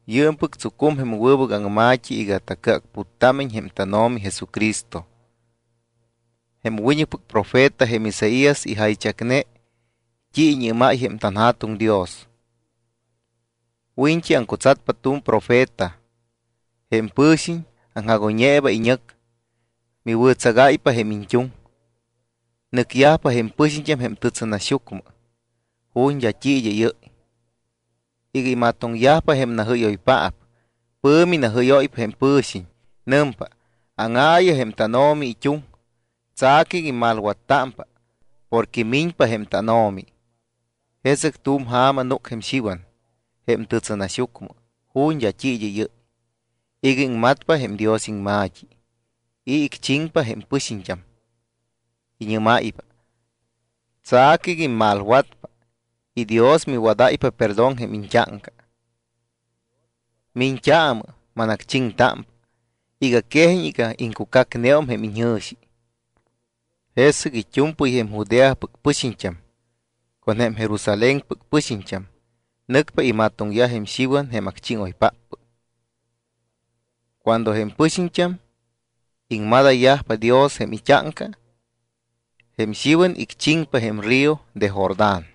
Yɨɨmpɨc tsucum jém wɨbɨc aŋma̱t́i iga tacɨacputtámiñ jém tánO̱mi Jesucristo. Jém wiñɨcpɨc profeta jém Isaías ijaychacne t́i iñɨ́máy jém tanJa̱tuŋ Dios: Wiñt́i aŋcutsatpa tu̱m profeta, jém pɨ̱xiñ aŋjagoyñeeba iñɨc. Miwɨ̱tsagáypa jém iñt́uŋ. Nɨcyajpa jém pɨxiñt́am jém tɨtsɨnaxyucmɨ ju̱t́ d́a t́i id́ɨ́yɨ́y iga imatoŋyajpa jém najɨ́yoypaap. Pɨ̱mi najɨ́yóypa jém pɨ̱xiñ. Nɨmpa: “Áŋáyaayɨ jém tánO̱mi it́uŋ. Tsa̱cɨ iga immalwattámpa porque miñpa jém tánO̱mi.” Jesɨc tu̱m ja̱ma núc jém Xiwan jém tɨtsɨnaxyucmɨ ju̱t́ d́a t́i id́ɨ́yɨ́y iga iŋmatpa jém Dios iŋma̱t́i y icchiŋpa jém pɨxiñt́am, iñɨ́máypa: —Tsa̱cɨ iga immalwatpa y Dios miwadáypa perdón jém iñt́áŋca. Miñt́aamɨ, manacchiŋtámpa iga quejiñ iga iŋcucacneum jém iñjɨ̱xi. Jesɨc it́u̱mpɨy jém Judeapɨc pɨxiñt́am con jém Jerusalénpɨc pɨxiñt́am nɨcpa imatoŋyaj jém Xiwan jém acchíŋoypáppɨc. Cuando jém pɨxiñt́am iŋmadayyajpa Dios jém it́áŋca, jém Xiwan icchiŋpa jém río de Jordán.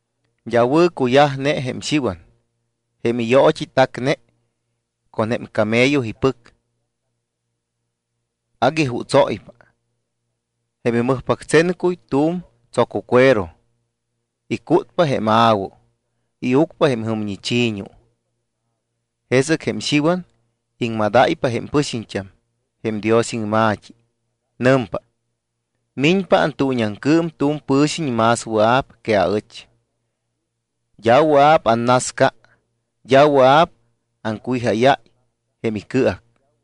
D́a wɨ̱cuyajne jém Xiwan. Jém iyoot́i tacne con jém camello ipɨc, agui jutsóypa. Jém imɨjpactsencuy tu̱m tsococuero. Icútpa jém a̱wu, iucpa jém jɨmñi chi̱ñu. Jesɨc jém Xiwan iŋmadáypa jém pɨxiñt́am jém Dios iŋma̱t́i. Nɨmpa: —Miñpa antuuñiaŋcɨɨm tu̱m pɨ̱xiñ más wɨa̱p que aɨch. D́a wɨa̱p annasca, d́a wɨa̱p aŋcuwijáyáy jém icɨac.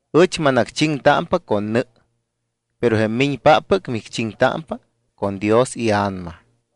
Ɨch manacchiŋtámpa con nɨ, pero jém miñpáppɨc micchiŋtámpa con Dios iA̱nama.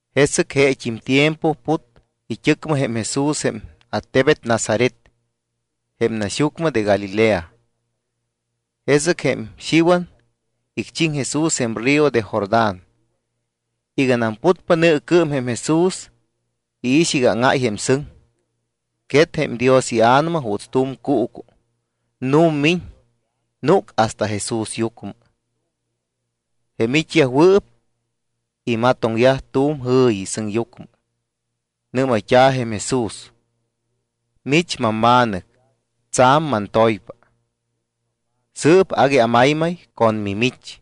Jesɨc jeet́im tiempo put it́ɨcmɨ jém Jesús jém attebet Nazaret jém naxyucmɨ de Galilea. Jesɨc jém Xiwan icchiŋ Jesús jém río de Jordán. Iganam putpa nɨɨcɨɨm jém Jesús, iix iga áŋáy jém sɨŋ. Quet jém Dios iA̱nama juuts tu̱m cuucu, nu̱mmiñ, núc hasta Jesúsyucmɨ. Jém it́yajwɨɨp imatoŋyaj tu̱m jɨ̱yi sɨŋyucmɨ. Nɨ́mayt́a̱ jém Jesús: —Mich mamma̱nɨc, tsa̱m mantoypa. Sɨɨp agui amaymay con mimich.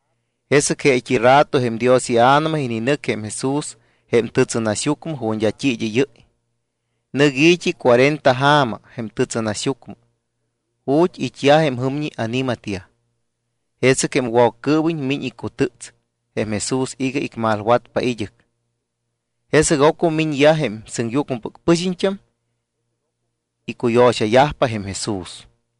Jesɨc jeet́i rato jém Dios iA̱nama ininɨc jém Jesús jém tɨtsɨnaxyucmɨ ju̱t́ d́a t́i id́ɨ́yɨ́y. Nɨc i̱t́i cuarenta ja̱ma jém tɨtsɨnaxyucmɨ ju̱t́ it́yaj jém jɨmñi ani̱matyaj. Jesɨc jém Woccɨɨwiñ miñ icutɨ́ts jém Jesús iga icmalwatpa id́ɨc. Jesɨc ocmɨ miñyaj jém sɨŋyucmɨpɨc pɨxiñt́am, icuyo̱xayajpa jém Jesús.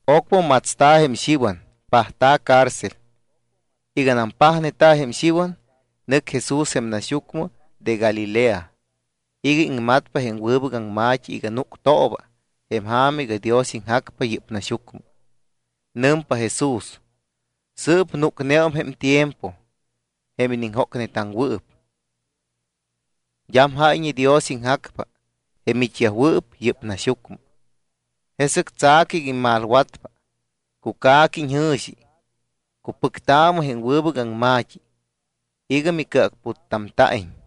Ocmɨ matsta̱ jém Xiwan, pajta̱ cárcel. Iganam pajneta̱ jém Xiwan, nɨc Jesús jém naxyucmɨ de Galilea iga iŋmatpa jém wɨbɨc aŋma̱t́i iga núctooba jém ja̱ma iga Dios iŋjacpa yɨ́p naxyucmɨ. Nɨmpa Jesús: —Sɨɨp núcneum jém tiempo jém iniŋjócnetaŋwɨɨp. D́am jáyñe Dios iŋjacpa jém it́yajwɨɨp yɨ́p naxyucmɨ. Jesɨc tsa̱cɨ iga immalwatpa, cuca̱cɨ iñjɨ̱xi, cupɨctaamɨ jém wɨbɨc aŋma̱t́i iga micɨacputtamta̱iñ.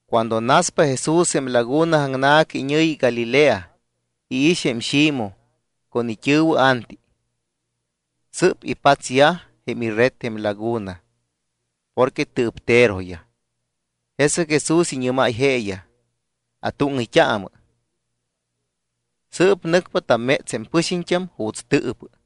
Cuando naspa Jesús jém laguna aŋna̱ca iñɨ̱yi Galilea, iix jém Ximoj con it́ɨ̱wɨ Anti. Sɨ́p ipatsyaj jém ired jém laguna porque tɨɨpteroyaj. Jesɨc Jesús iñɨ́máy jeeyaj: —Atúŋɨyt́aamɨ. Sɨɨp nɨcpa tamméts jém pɨxiñt́am juuts tɨɨpɨ.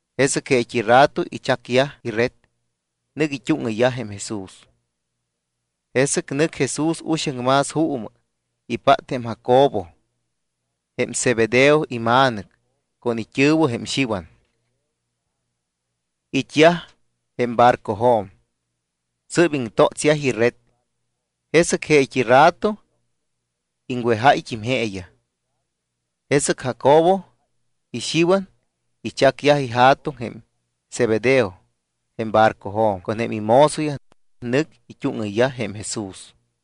Jesɨc jeet́i rato ichacyaj ired, nɨc it́úŋɨyyaj jém Jesús. Jesɨc nɨc Jesús uxaŋ más juumɨ, ipát jém Jacobo, jém Zebedeo ima̱nɨc, con it́ɨ̱wɨ jém Xiwan. It́yaj jém barcojo̱m, sɨ́p iŋtótsyaj ired. Jesɨc jeet́i rato iŋwejáyt́im jeeyaj. Jesɨc Jacobo y Xiwan ichacyaj ija̱tuŋ jém Zebedeo jém barcojo̱m con jém imozoyaj. Nɨc it́úŋɨyyaj jém Jesús.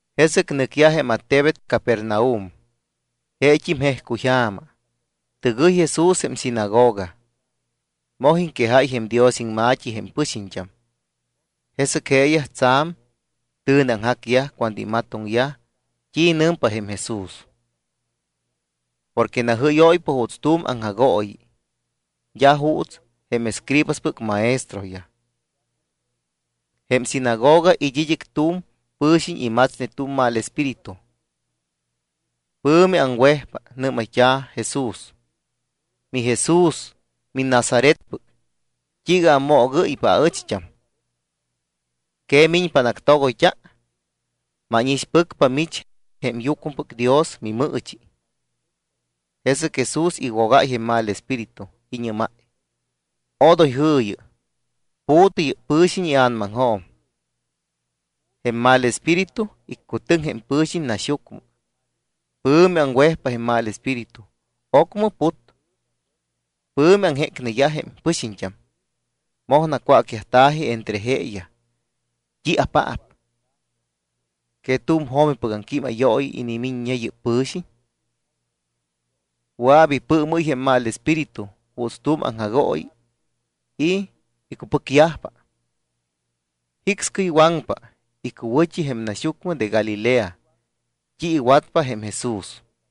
Jesɨc nɨcyaj jém attebet Capernaum. Jeet́im jejcuyja̱ma, tɨgɨy Jesús jém sinagoga. Moj iŋquejáy jém Dios iŋma̱t́i jém pɨxiñt́am. Jesɨc jeeyaj tsa̱m tɨ̱neaŋjacyaj cuando imatoŋyaj t́i nɨmpa jém Jesús. Porque najɨ́yóypa juuts tu̱m aŋjagooyi d́a juuts jém escribaspɨc maestroyaj. Jém sinagoga it́ id́ɨc tu̱m pɨ̱xiñ imatsne tu̱m mal espíritu. Pɨ̱mi aŋwejpa, nɨ́mayt́a̱ Jesús: —MiJesús miNazaretpɨc, ¿t́iiga ammoogɨ́ypa aɨcht́am? ¿Que miñpa anactogoyt́a? Mánixpɨcpa, mich jém Yucmɨpɨc Dios miMɨɨchi. Jesɨc Jesús iwogáy jém mal espíritu, iñɨ́máy: —Odoy jɨ̱yɨ. Pu̱tɨ yɨ́p pɨ̱xiñ ia̱namaŋjo̱m. Jém mal espíritu iccutɨŋ jém pɨ̱xiñ naxyucmɨ. Pɨ̱mi aŋwejpa jém mal espíritu, ocmɨ put. Pɨ̱mi aŋjécneyaj jém pɨxiñt́am. Moj nacwácyajta̱ji entre jeeyaj: —¿T́iapaap? ¿Que tu̱m jo̱mipɨc aŋquímayooyi inimiññe yɨ́p pɨ̱xiñ? Wɨa̱p ipɨɨmɨ́y jém mal espíritu juuts tu̱m aŋjagooyi y icupɨcyajpa. Jicscɨy waŋpa icuwɨ̱t́i jém naxyucmɨ de Galilea t́i iwatpa jém Jesús.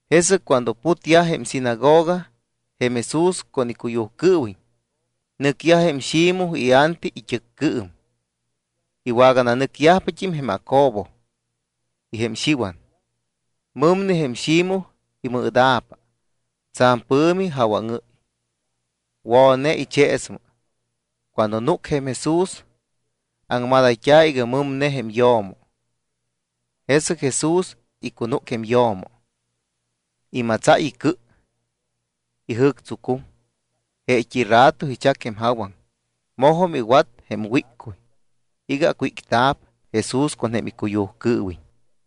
Jesɨc cuando putyaj jém sinagoga jém Jesús con icuyujcɨɨwiñ, nɨcyaj jém Ximoj y Anti it́ɨccɨɨm, iwagananɨcyajt́im jém Jacobo y jém Xiwan. Mɨmne jém Ximoj imɨɨda̱pa. Tsa̱m pɨ̱mi jawaŋɨ́y. Wo̱ne icheesmɨ. Cuando núc jém Jesús, aŋmadayt́a̱ iga mɨmne jém yo̱mo. Jesɨc Jesús icunúc jém yo̱mo, imatsáy icɨ, ijɨ̱ctsucum. Jeet́i rato ichac jém jawaŋ, mojum iwat jém wíccuy iga acwícta̱p Jesús con jém icuyujcɨɨwiñ.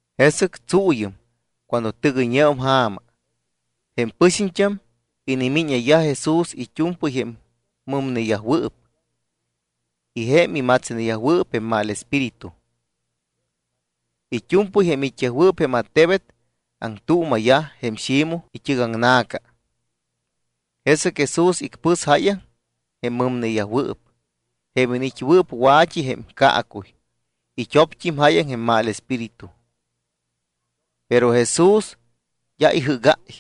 Jesɨc tsuuyɨm cuando tɨgɨyñeum ja̱ma, jém pɨxiñt́am inimíñayyaj Jesús it́u̱mpɨy jém mɨmneyajwɨɨp y jém imatsneyajwɨɨp jém mal espíritu. It́u̱mpɨy jém it́yajwɨɨp jém attebet aŋtuuma̱yaj jém Ximoj it́ɨgaŋna̱ca. Jesɨc Jesús icpɨs jáyaŋ jém mɨmneyajwɨɨp, jém iniit́yajwɨɨp wa̱t́i jém caacuy. It́opt́im jáyaŋ jém mal espíritu. Pero Jesús d́a ijɨ́gáy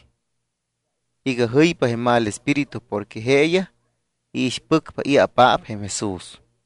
iga jɨypa jém mal espíritu porque jeeyaj iixpɨcpa i̱apaap jém Jesús.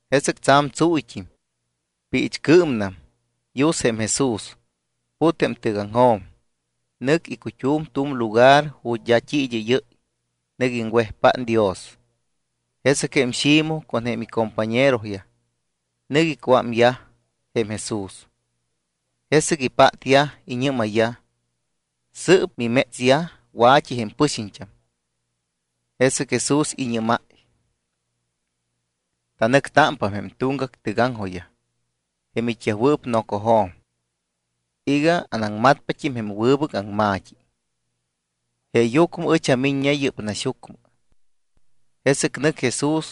Jesɨc tsa̱m tsuuyt́im, piichcɨɨmnam, yus jém Jesús. Put jém tɨgaŋjo̱m, nɨc icut́um tu̱m lugar ju̱t́ d́a i̱ id́ɨ́yɨ́y. Nɨc iŋwejpát Dios. Jesɨc jém Ximoj con jém icompañeroyaj nɨc icuámyaj jém Jesús. Jesɨc ipátyaj, iñɨ́mayyaj: —Sɨ́p mimétsyaj wa̱t́i jém pɨxiñt́am. Jesɨc Jesús iñɨ́máy: —Tanɨctámpa jém tuŋgac tɨgaŋjojyaj jém it́yajwɨɨp nocojo̱m iga anaŋmatpat́im jém wɨbɨc aŋma̱t́i. Jeeyucmɨ ɨch amiññe yɨ́p naxyucmɨ. Jesɨc nɨc Jesús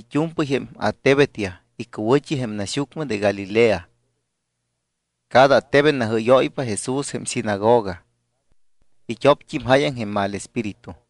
it́u̱mpɨy jém attebetyaj icuwɨ̱t́i jém naxyucmɨ de Galilea. Cada attebet najɨ́yóypa Jesús jém sinagoga. It́opt́im jáyaŋ jém mal espíritu.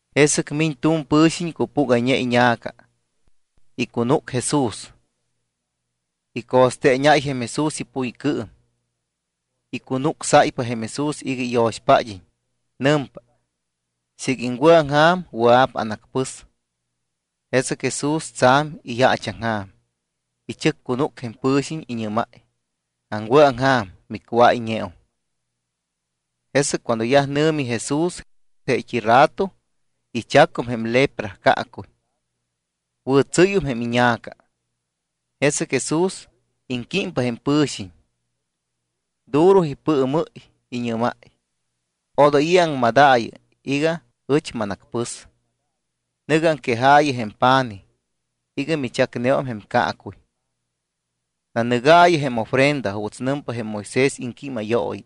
Jesɨc miñ tu̱m pɨ̱xiñ cupúgayñe iña̱ca, icunúc Jesús. Ico̱steeñáy jém Jesús ipuycɨɨm. Icunucsáypa jém Jesús iga iyo̱xpád́iñ, nɨmpa: —Siiga iŋwɨ̱aŋja̱m, wɨa̱p anacpɨs. Jesɨc Jesús tsa̱m iyaachaŋja̱m, ichɨccunúc jém pɨ̱xiñ, iñɨ́máy: —Aŋwɨ̱aŋja̱m. Micuáyñeum. Jesɨc cuando yaj nɨ̱mi Jesús, jeet́i rato ichacum jém lepra caacuy, wɨ̱tsɨ́yum jém iña̱ca. Jesɨc Jesús iŋquímpa jém pɨ̱xiñ, duro ipɨɨmɨ́y, iñɨ́máy: —Odoy i̱ aŋmadaayɨ iga ɨch manacpɨs, nɨ̱gɨ aŋquejaayɨ jém pa̱nij iga michacneum jém caacuy. Nanɨgaayɨ jém ofrenda juuts nɨmpa jém Moisés iŋquímayooyi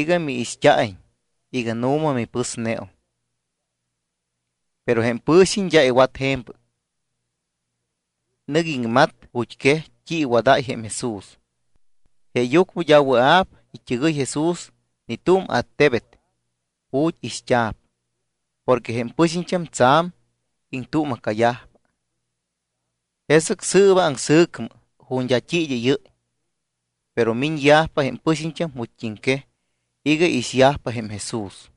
iga miixt́a̱iñ iga nu̱ma mipɨsneum. Pero jém pɨ̱xiñ d́a iwat je̱mpɨc. Nɨc iŋmat ju̱t́quej t́i iwadáy jém Jesús. Jeeyucmɨ d́a wɨa̱p it́ɨgɨy Jesús ni tu̱m attebet ju̱t́ ixt́a̱p porque jém pɨxiñt́am tsa̱m iŋtuuma̱cayajpa. Jesɨc sɨɨba aŋsɨ̱cmɨ ju̱t́ d́a t́i id́ɨ́yɨ́y. Pero miñyajpa jém pɨxiñt́am ju̱t́quej iga iixyajpa jém Jesús.